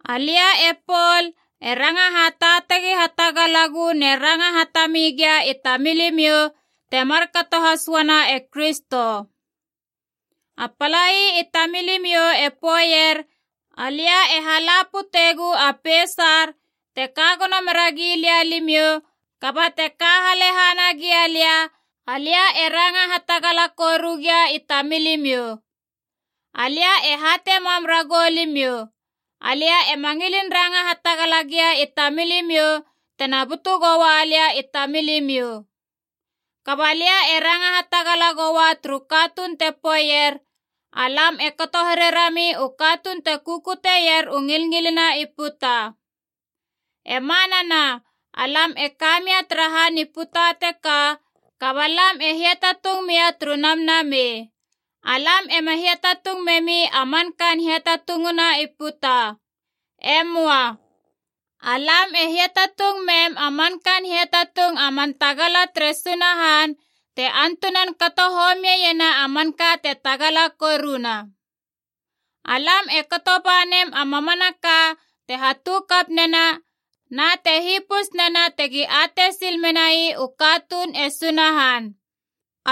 Alia e Pol, e ranga hataatagi hatagalagu na e ranga hatami gia i tamilimiou, te markato has uana e Kristo. A palai i tamilimiou e poeier alia e hala putegu a peisar te ka gono meragi lia limiou, kaba te ka halehana gialia, alia e ranga hatagala koru gia i tamilimiou. Alia e hatei mam ragou limiou, alia ema ngilin ranga hatagala gia i tamilimiou tena butu goua lia i tamilimiou. Kaba lia e ranga hatagala goua turu katuun te poeier, alam e kato here rami u katuun te kukutier u ngilngilina i puta. E manana, alam e ka mia tara han i puta teka, kaba lam e hiatatung mia turu namnamei. Alam ema hiatatung memi a mankaan hiatatunguna i puta. E möa. Alam e hiatatung mem a man kaan hiatatung a man tagala tere Sunahan te antunan kato homiena a manka te tagala koruna. Alam e kato ba nem a mamanaka te hatu kap nena na te hipus nena tegi atei sil menai u katuun e Sunahan.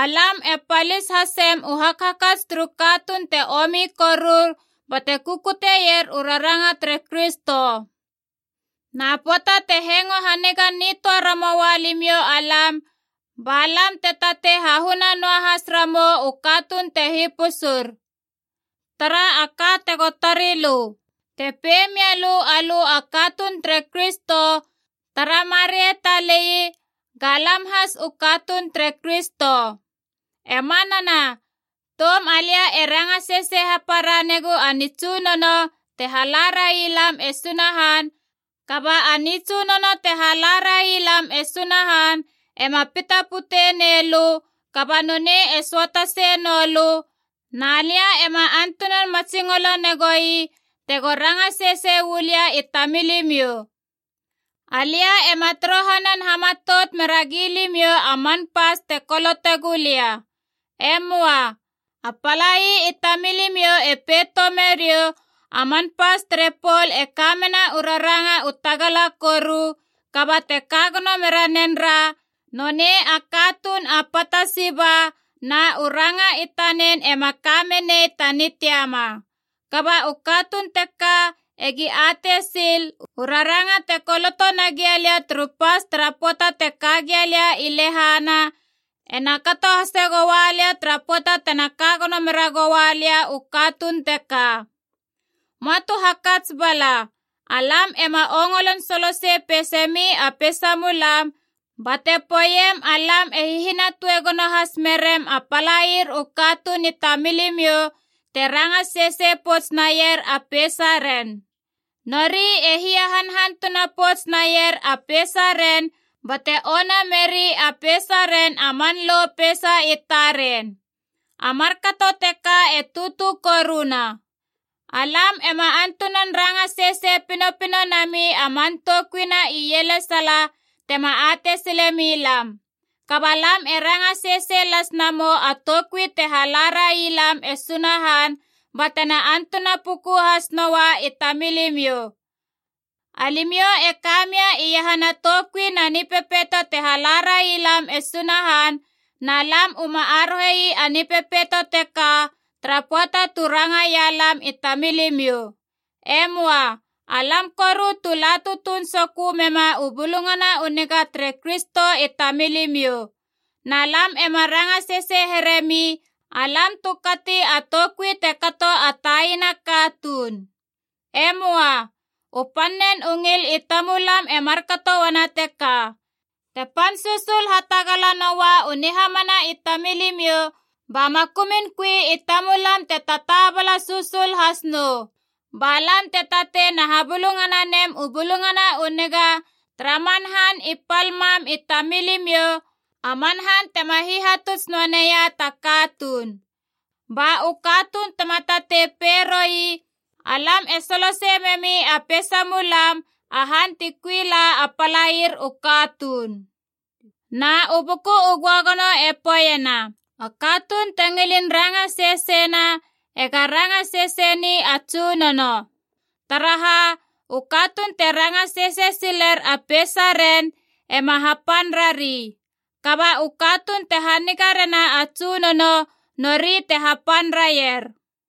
Alam e palis hasem u hakhakats turu katuun te omi korur bate kukuteier u ranga tere Kristo. Na pöata te hengo haniga nitöa ramoua limiou alam, ba lam te tatei hahuna noahas ramou u katuun te hipusur. Tara a ka tego tarilö. Te pei mialö alö a katuun tere Kristo, tara marei talei, ga lam has u katuun tere Kristo. E manana, toum alia e ranga sesei hapara negu a nitsunono te hala railam e Sunahan, kaba a nitsunono te hala railam e Sunahan ema pita pute neilö kaba nonei e söataseie noulö, na lia ema antunan matsingolo negoi tego ranga sesei uu lia i tamilimiou. Alia ema torohanan hamatout meragi limiou a man pas te kolotegu lia. E möa. A palai i tamilimiou e pei toume riou, A man pas tere Pol e ka mena u raranga u tagala koru, kaba te ka gono mera nen ra, nonei a katuun a pata siba na u ranga i tanen ema ka menei ta nitiama. Kaba u katuun teka egi atei sil, u raranga te koloto nagia lia turu pas tara pöata te ka gia lia i lehana ena kato hase goua lia tara pöata tena ka gono meragoua lia u katuun teka. Möa tu hakats bala, alam ema ongolon solosei peise mi a peisamulam bate poeiem alam e hihinatue gono has merem a palair u katuun i tamilimiou te ranga sesei pouts naier a peisaren. Nori e hiahanhantuna pouts naier a peisaren bate ona meri a peisaren a man lo peisa i taren. A markato teka e tutu koruna. Alam ema antunan ranga sesei pinopino nami a man toukui na ielesala tema atei silemilam. Kaba lam e ranga sesei las namou a toukui te hala railam e Sunahan, ba tena antuna puku has noua i tamilimiou. Alimiou e ka mia iahana toukui na nipepeito te hala railam e Sunahan na lam uma arohe ii a nipepeito teka tara pöata tu rangaia lam i tamilimiou. E möa. Alam koru tu la tutuun sokö mema u Bulungana u Niga tere Kristo i tamilimiou. Na lam ema ranga sesei heremi alam tu kati a toukui te kato a taina katuun. E möa. U pannen u ngil i tamulam e markato uana teka, te pan susul hatagala noua u nihamana i tamilimiou ba makumun kui i tamulam te tataabala susul has nou. Ba lam te tatei na habulungana nem u Bulungana u Niga tara man han i pal mam i tamilimiou, a man han tema hihatuts noa neia ta katuun. Ba u katuun tema tatei pei roi alam e solosei memi a peisamulam a han ti kui la a palair u katuun. Na u Buku u Göagono e poeiena, A katuun te ngilin ranga seseina ega ranga sesei ni a Tsunono. Taraha, u katuun te ranga sesei siler a peisaren ema hapan rari. Kaba u katuun te haniga rena a Tsunono nori te hapan raier.